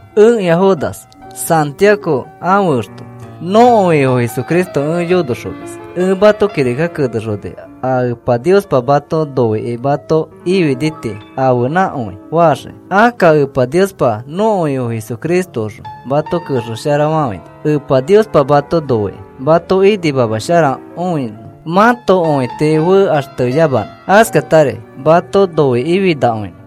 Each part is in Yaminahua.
Ẽkĩa Judas, Santiago ãfe exto. Nõko Ifo Jesucristo ẽ yonoxomis. Ẽ mato kirika kenexoni a Epa Niospa mato noikĩ mato ifini tii ãfenãkõi faxiki. Akka Epa Niospa nõko Ifo Jesucristoõxõ mato kexesharafafãini. Epa Niospa mato noikĩ, mato inimamasharakõinõ mãto õiti fekaxteyamanõ, askatari mato noikĩfinakõinõ.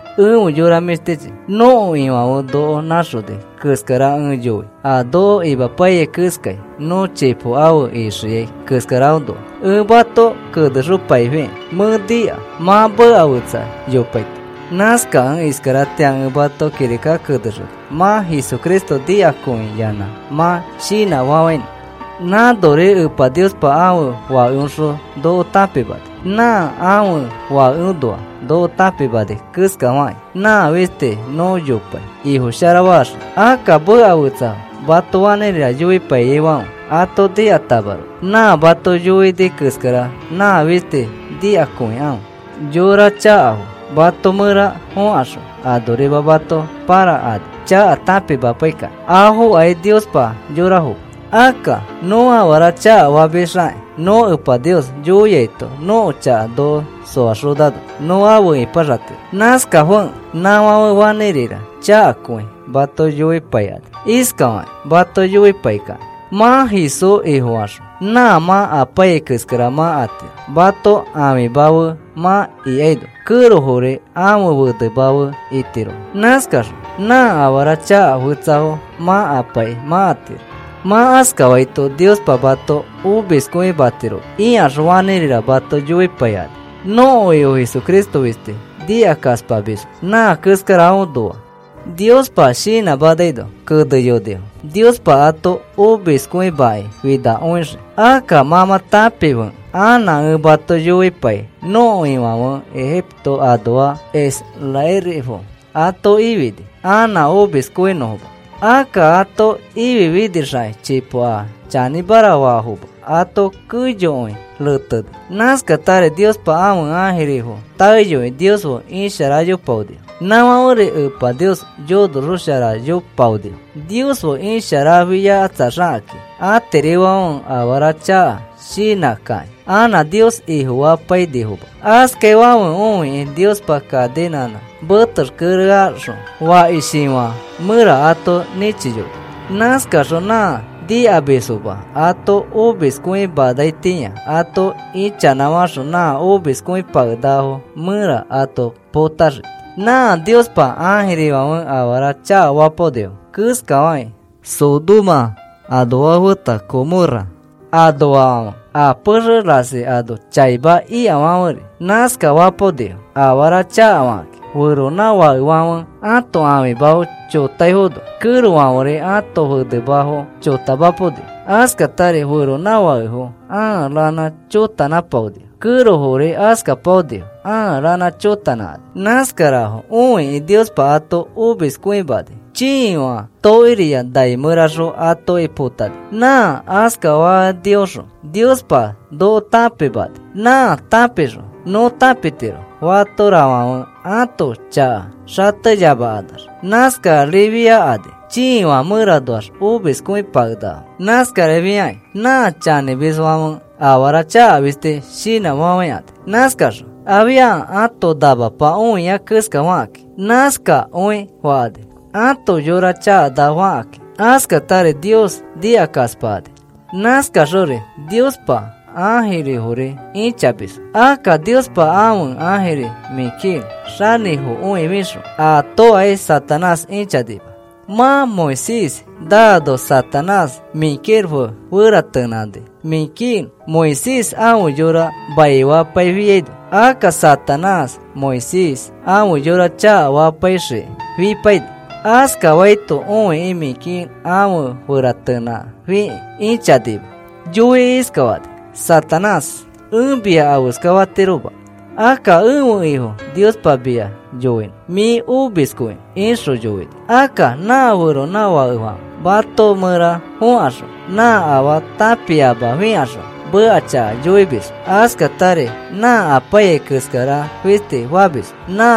Efe yora mĩshtichi, nõko Ifãfe noko nãxoni keskara ẽ yoi, a noko imapaiyai keskai nõ chipo afe ixiai keskaraõnoa ẽ mato kenexopaifikĩ mẽ nika mã meka fetsa yopaito. Nãskakẽ iskaratĩa ẽ mato kirika kenexoni mã Jesucristo nikakõiyanã mã shinãfafãinõ. Nãnori Epa Niospa ãfe Fakeõxõ noko tãpimani. Nã ãfe Fakeõnoa noko tãpimani keskafakĩ nã fisti nõ yopai Ifo sharafaxiki. Akka meka fetsa mato fanĩrira yoipaiyaifãfe ato nikatamaroko nã mato yoini keskara nã fisti nikakõikãfe. Yora chakafo mato mẽra fõkaxõ anorima mato pãrakani chaka tãpimapaikakĩ. Afokai Niospa yorafoma. Akka nõ afara chakafamisxakĩ nõ Epa Nios yoiaito nõko chaka noko soaxonano nõ afe ipaxatiro. Nãskafekẽ nãfãfe fanĩrira chakakõi mato yoipaikani, iskafakĩ mato yoipaikakĩ: “Mã Jesús Ifofaxõ nã mã apaiyai keskara mã atiro, mãto ãfima fe mã ikaino, kẽrofori ãfe fenema fe itirofo. Nãskaxõ nã afara chaka fetsafo mã apaikĩ mã atiro. Mã askafaito Niospa mato omiskõimatiroma,” ikaxõ fanĩrira mato yoipaikani. Nõko Ifo Jesucristo fisti nikakaspamisfo. Nã keskarafoõnoa Niospa shinãmanaino keneyonifo Niospa ato omiskõimakĩ finakõixii. Akka mã mã tãpifekẽ anã ẽ mato yoipai nõko Ifãfe Ejipto anoa israelifo ato ifini anã omiskõinõfoma. Akka ato ififinixakĩ chipo a chanĩmara faafoma ato keyokõi reteni. Nãskatari Niospa ãfe ãjirifo taeyoi Nios fe isharayopaonifo. Nãfãferi Epa Nios yonosharaxoyopaonifo. Nios fe isharafiakatsaxakĩ atirifãfe afara chaka shinãkakĩ anã Nios Ifofapainifoma. Askaifãfe õikĩ Niospa kaninãnã metexkereaxõ fakishifã mẽra ato nĩchiyoni. Nãskaxõ nã nikamisfoma ato omiskõimanaitĩa ato ichanãfaxõ nã omiskõipakenakafo mẽra ato potaxii. Nã Niospa ãjirifãfe afara chakafapaonifo keskafakĩ Sodoma anoafo feta Gomorra anoafãfe a pexe rasi ano chaima ikafãferi nãskafapaonifo afara chakafakakĩ. Feronãfakefãfe ãto ãfimafo chotaifono, kẽrofãferi ãto fenemafo chotamapaonifo. Askatari feronãfakefo ãa ranã chotanãpaonifo, kẽrofori askapaonifo ãa ranã chotanãkani. Nãskarafo õikĩ Niospa ato omiskõimani, chiifã tokiriya nai mẽraxõ atoki potani. Nã askafanioxõ Niospa noko tãpimani. Nã tãpixõ nõ tãpitiro fatorafãfe ãto chaka xateyamakanax nãskarifiakani, chiifã mẽranoax omiskõipakenakafo. Nãskarifiakĩ nã chanĩmisfãfe afara chaka fisti shinãfafãikani. Nãskakaxõ afia ãto namapa õia keskafakakĩ, nãskakõi fakani, ãto yora chakanafakakĩ. Askatari Nios nikakaspakani. Nãskakaxori Niospa ãjirifori ĩchamisfo. Akka Niospa ãfe ãjiri Miguel xanĩfokõifixõ atokai Satanás ĩchanima. Mã Moisés naano Satanás Miguel fe feratenãni. Miguel Moisés ãfe yora maifapaifiaino, akka Satanás Moisés ãfe yora chakafapaixikĩ fipaini. Askafaito õikĩ Miguel afe feratenãfikĩ ĩchanima. Yoikĩ iskafani: “Satanás, ẽ mia afeskafatiroma. Akka ẽfe Ifo Niospa mia yoinõ mĩ omiskõinõ,” ixõ yoini. Akka nã feronãfakefãfe mato mẽra fõkaxõ nã afaa tãpiamafikaxõ meka chaka yoimisfo. Askatari nã apaiyai keskara fisti famisfo, nã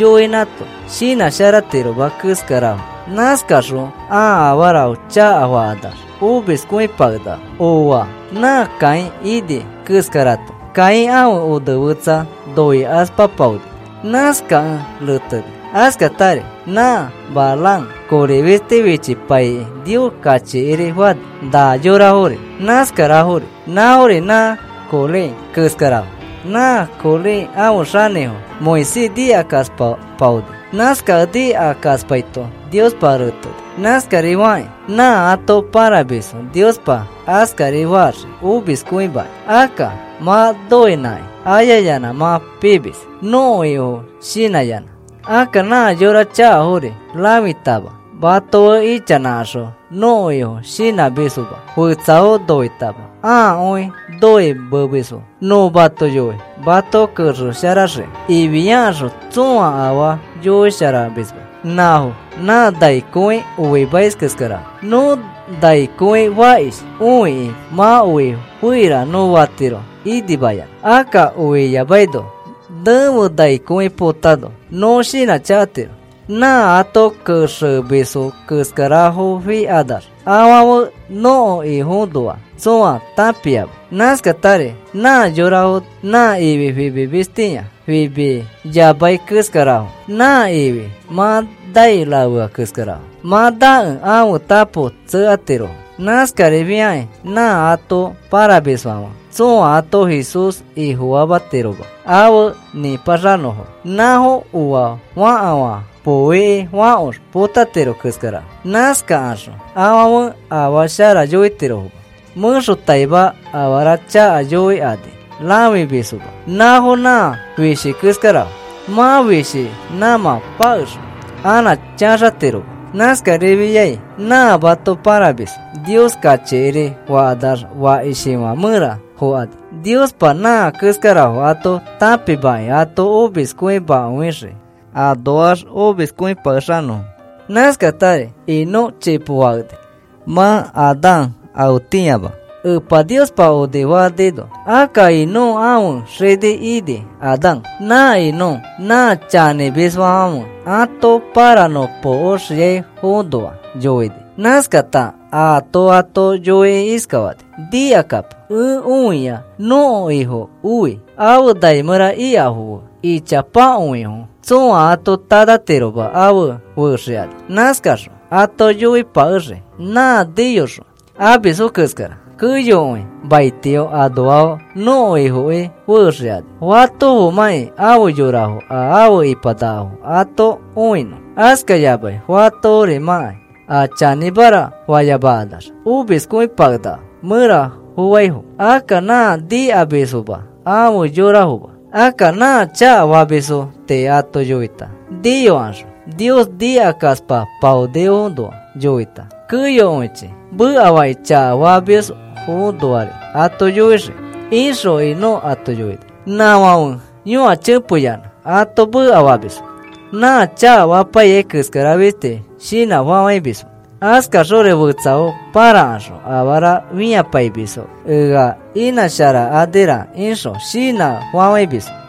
yoinãto shinãsharatiroma keskarafo. Nãskakaxõ ãa afarafo chakafakanax omiskõipakenakafo. Ooa. Nã Caín ini keskarato. Caín ãfe onefetsa noikaspapaoni. Nãskakẽ reteni. Askatari nã Balaam kori fisti fichipaikĩ Nios kachikiri fani. Na yorafori nãskarafori. Nãfori nã Coré keskarafo. Nã Coré ãfe xanĩfo Moisés nikakaspapaoni. Nãskakẽ nikakaspaito Niospa reteni, nãskarifakĩ nã ato pãramisfo Niospa askari faxii omiskõimakĩ. Akka mã noinãkĩ ayayanã mã pimis nõko Ifo shinãyanã. Akka nã yora chakafori rãfitama mato fe ichanãkaxõ nõko Ifo shinãmisfoma. Fetsafo noitama ãakõi noimemisfo. “Nõ mato yoi mato kexesharaxiki,” ifiakaxõ tsõa afaa yoisharamisma. Nãfo nã nai kõi oimais keskarafo. Nõ nai kõi fakish õikĩ mã oi feira nõ fatiro inimayanã. Akka oi iyamaino nẽfe nai kõi potano nõ shinãchakatiro. Nã ato kexemisfo keskarafofikanax afãfe nõko Ifoõnoa tsõa tãpiama. Nãskatari nã yorafo nã ifi fimimistĩa fimiyamai keskarafo. Nã ifi mã nai rafea keskarafo, mã nakẽ ãfe tapo tsekatirofo. Nãskarifiakĩ nã ato pãramisfãfe tsõa ato Jesús Ifofamatiroma afe nĩpaxanõfo. Nãfo oa fakafã poo ikĩ fãkox potatiro keskarafo. Nãskakaxõ afãfe afaa shara yoitirofoma, mẽxotaima afara chaka yoikani rãfimisfoma. Nãfo nã fishi keskarafo. Mã fishi nãmã pakexõ, anã chaxatiroma. Nãskarifiai nã mato pãramisfo Nios kachikiri fakanax fakishifã mẽra fokani, Niospa nã keskarafo ato tãpimakĩ ato omiskõimakõixii anoax omiskõipakexanõfo. Nãskatari Enoc chipo fakeni, mã Adán afetĩama Epa Niospa onifanino. Akka Enoc ãfe xini ini Adán. Nã Enoc nã chanĩmisfãfe ato pãranõpokoxiaifoõnoa yoini. Nãskata aato ato yoikĩ iskafani: “Nikakapo, ẽ õia nõko Ifo oi, afe nai mẽra ikafo fe ichapakõifo tsõa ato tanatiroma afe fexikani. Nãskaxõ ato yoipakexii nã niyoxõ amisfo keskara. Keyokõi maitio anoafo nõko Ifoki fexikani, fatofomãki afe yorafo a afe ipanakafo ato õinõ, askayamai fatoforimãkai a chanĩmara fayamakanax omiskõipakenakafo mẽra foaifo. Akka nã nikamisfoma afe yorafoma. Akka nã chakafamisfo tii ato yoita, niyokaxõ Nios nikakaspapaonifoõnoa yoita, keyokõichi mekafakĩ chakafamisfoõnoari ato yoixii,” ixõ Enoc ato yoini. Nãfãfe yõachepeyanã ato mekafamisfo. Nã chakafapaiyai keskara fisti shinãfafãimisfo. Askaxori fetsafo pãrakaxõ afara fĩapaimisfo ea inãsharakanira ixõ shinãfafãimisfo.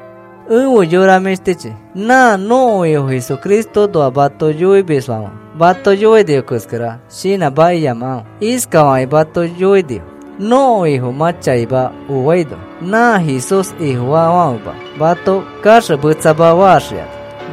Efe yora mĩshtichi, nã nõko Ifo Jesucristoõnoa mato yoimisfãfe mato yoinifo keskara shinãmakiyamakãfe. Iskafakĩ mato yoinifo: “Nõko Ifo mã chaima oaino nã Jesús Ifofaafãfema mato kaxemetsama faxikani,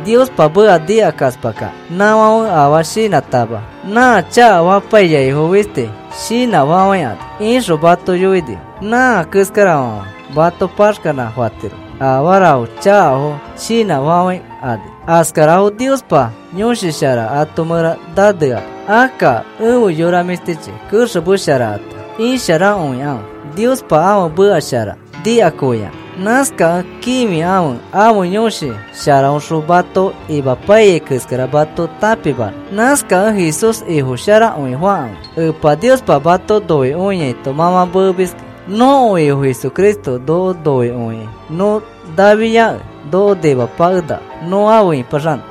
Niospa meka nikakaspakakĩ. Nãfãfe afaa shinãtama nã chakafapaiyaifo fisti shinãfafãikani,” ixõ mato yoinifo. Nã keskarafãfe mato paxkanã fatirofo, afarafo chakafo shinãfafãikani. Askarafo Niospa Yõshi Shara ato mẽra naneama. Akka efe yora mĩshtichi, kexemesharata isharakõikãfe Niospa ãfe meka shara nikakõiyanã. Nãskakẽ kĩfikãfe ãfe Yõshi Sharaõxõ mato imapaiyai keskara mato tãpimanõ. Nãskakẽ Jesús Ifosharakõifakãfe, Epa Niospa mato noikõiaito mã mã meemiski. Nõko Ifo Jesucristo noko noikõikĩ nõ nafiakẽ noko nimapakenaka nõ afe ĩpaxanõ.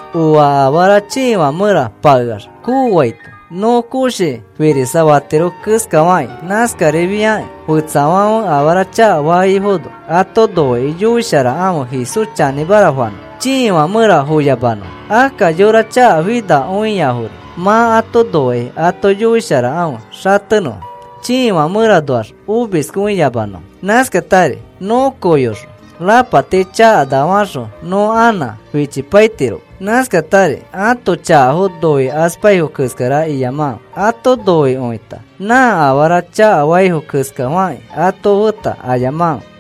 Oa afara chiifã mẽra pakeax koofaito, nõ koshi firisafatiro keskafakĩ nãskarifiakĩ fetsafãfe afara chakafaifono ato noikĩ yoisharakãfe Jesús chanĩmara fanõfo, chiifã mẽra foyamanõfo. Akka yora chakafinakõiafori mã ato noikĩ ato yoisharakãfe xatenõfo, chiifã mẽranoax omiskõiyamanõfo. Nãskatari nõ kooyoxõ rapati chakana faxõ nõ anã fichipaitiroma. Nãskatari ãto chakafo noikaspaifo keskara iyamakãfe. Ato noikõita nã afara chakafaifo keskafakĩ ato feta ayamakãfe.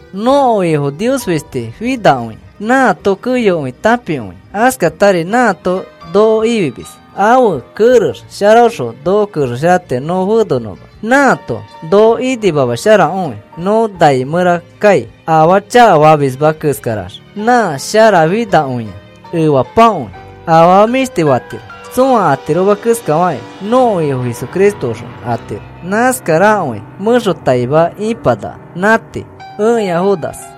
Nõko Ifo Nios fisti finakõia, nãato keyokõi tãpiakõia. Askatari nãato noko ifimis. Ãfe kerex sharaõxõ noko kexesharatiro nõ fenonõma. Nãato noko inimamasharakõi nõ nai mẽra kai, afaa chakafamisma keskarax. Nã sharafinakõia, efapakõi, afama mĩshti fatiro, tsõa atiroma keskafakĩ nõko Ifo Jesucristoõxõ atiro. Nãskarakõi mẽxotaima ĩpanaka. Nã tii. Ẽkĩa Judas